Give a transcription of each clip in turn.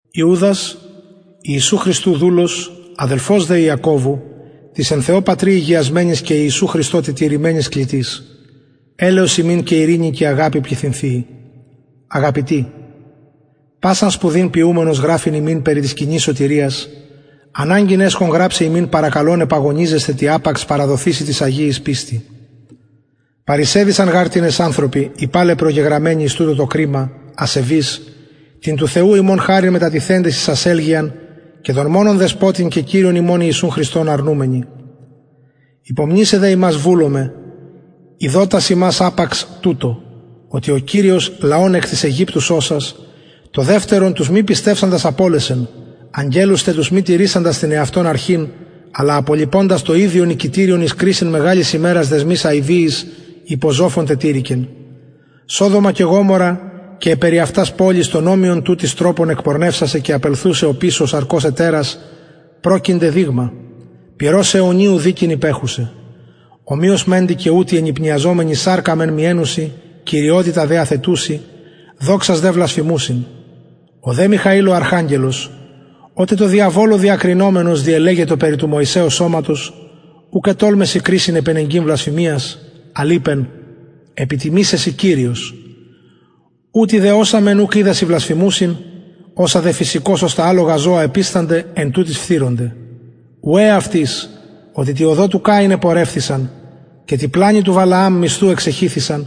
ιουδας ιησου χριστου δουλος αδελφος δε ιακωβου τοις εν θεω πατρι ηγιασμενοις και ιησου χριστω τετηρημενοις κλητοις ελεος υμιν και ειρηνη και αγαπη πληθυνθειη αγαπητοι πασαν σπουδην ποιουμενος γραφειν υμιν περι της κοινης σωτηριας αναγκην εσχον γραψαι υμιν παρακαλων επαγωνιζεσθαι τη απαξ παραδοθειση τοις αγιοις πιστει παρεισεδυσαν γαρ τινες ανθρωποι οι παλαι προγεγραμμενοι εις τουτο το κριμα ασεβεις την του θεου ημων χαριν μετατιθεντες εις ασελγειαν και τον μονον δεσποτην θεον και κυριον ημων ιησουν χριστον αρνουμενοι υπομνησαι δε υμας βουλομαι ειδοτας υμας απαξ τουτο οτι ο κυριος λαον εκ γης αιγυπτου σωσας το δευτερον τους μη πιστευσαντας απωλεσεν αγγελους τε τους μη τηρησαντας την εαυτων αρχην αλλα απολιποντας το ιδιον οικητηριον εις κρισιν μεγαλης ημερας δεσμοις αιδιοις υπο ζοφον τετηρηκεν ως σοδομα και γομορρα και αι περι αυτας πολεις τον ομοιον τουτοις τροπον εκπορνευσασαι και απελθουσαι οπισω σαρκος ετερας προκεινται δειγμα πυρος αιωνιου δικην υπεχουσαι ομοιως μεντοι και ουτοι ενυπνιαζομενοι σαρκα μεν μιαινουσιν κυριοτητα δε αθετουσιν δοξας δε βλασφημουσιν ο δε μιχαηλ ο αρχαγγελος οτε τω διαβολω διακρινομενος διελεγετο περι του μωυσεως σωματος ουκ ετολμησεν κρισιν επενεγκειν βλασφημιας αλλ ειπεν επιτιμησαι σοι κυριος ουτοι δε οσα μεν ουκ οιδασιν βλασφημουσιν οσα δε φυσικως ως τα αλογα ζωα επιστανται εν τουτοις φθειρονται ουαι αυτοις οτι τη οδω του καιν επορευθησαν και τη πλανη του βαλααμ μισθου εξεχυθησαν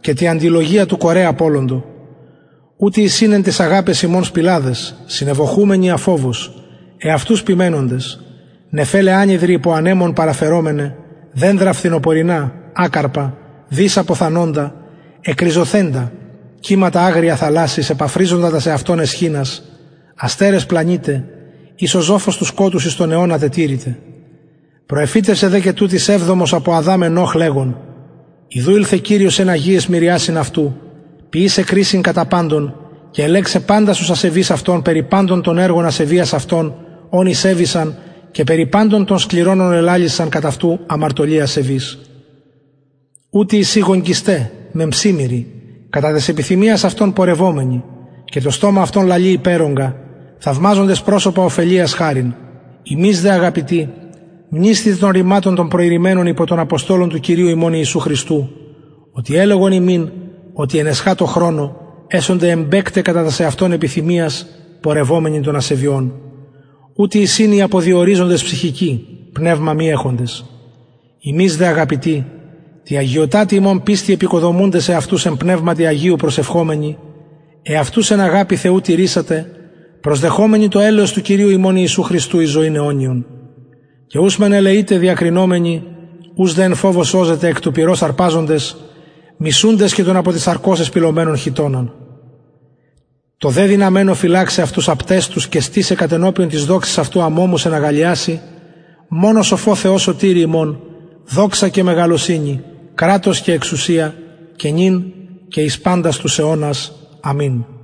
και τη αντιλογια του κορε απωλοντο ουτοι εισιν εν ταις αγαπαις υμων σπιλαδες συνευωχουμενοι αφοβως εαυτους ποιμαινοντες νεφελαι ανυδροι υπο ανεμων παραφερομεναι δενδρα φθινοπωρινα ακαρπα δις αποθανοντα εκριζωθεντα κυματα αγρια θαλασσης επαφριζοντα τας εαυτων αισχυνας αστερες πλανηται οις ο ζοφος του σκοτους εις αιωνα τετηρηται προεφητευσεν δε και τουτοις εβδομος απο αδαμ ενωχ λεγων ιδου ηλθεν κυριος εν αγιαις μυριασιν αυτου ποιησαι κρισιν κατα παντων και ελεγξαι παντας τους ασεβεις αυτων περι παντων των εργων ασεβειας αυτων ων ησεβησαν και περι παντων των σκληρων ων ελαλησαν κατ αυτου αμαρτωλοι ασεβεις ουτοι εισιν γογγυσται μεμψιμοιροι κατα τας επιθυμιας αυτων πορευομενοι και το στομα αυτων λαλει υπερογκα θαυμαζοντες προσωπα ωφελειας χαριν υμεις δε αγαπητοι μνησθητε των ρηματων των προειρημενων υπο των αποστολων του κυριου ημων ιησου χριστου οτι ελεγον υμιν οτι εν εσχατω χρονω εσονται εμπαικται κατα τας εαυτων επιθυμιας πορευομενοι των ασεβειων ουτοι εισιν οι αποδιοριζοντες ψυχικοι πνευμα μη εχοντες υμεις δε αγαπητοι τη αγιωτατη υμων πιστει εποικοδομουντες εαυτους εν πνευματι αγιω προσευχομενοι εαυτους εν αγαπη θεου τηρησατε προσδεχομενοι το ελεος του κυριου ημων ιησου χριστου εις ζωην αιωνιον και ους μεν ελεειτε διακρινομενοι ους δε εν φοβω σωζετε εκ πυρος αρπαζοντες μισουντες και τον απο της σαρκος εσπιλωμενον χιτωνα τω δε δυναμενω φυλαξαι αυτους απταιστους και στησαι κατενωπιον της δοξης αυτου αμωμους εν αγαλλιασει μονω σοφω θεω σωτηρι ημων δοξα και μεγαλωσυνη κρατος και εξουσια και νυν και εις παντας τους αιωνας αμην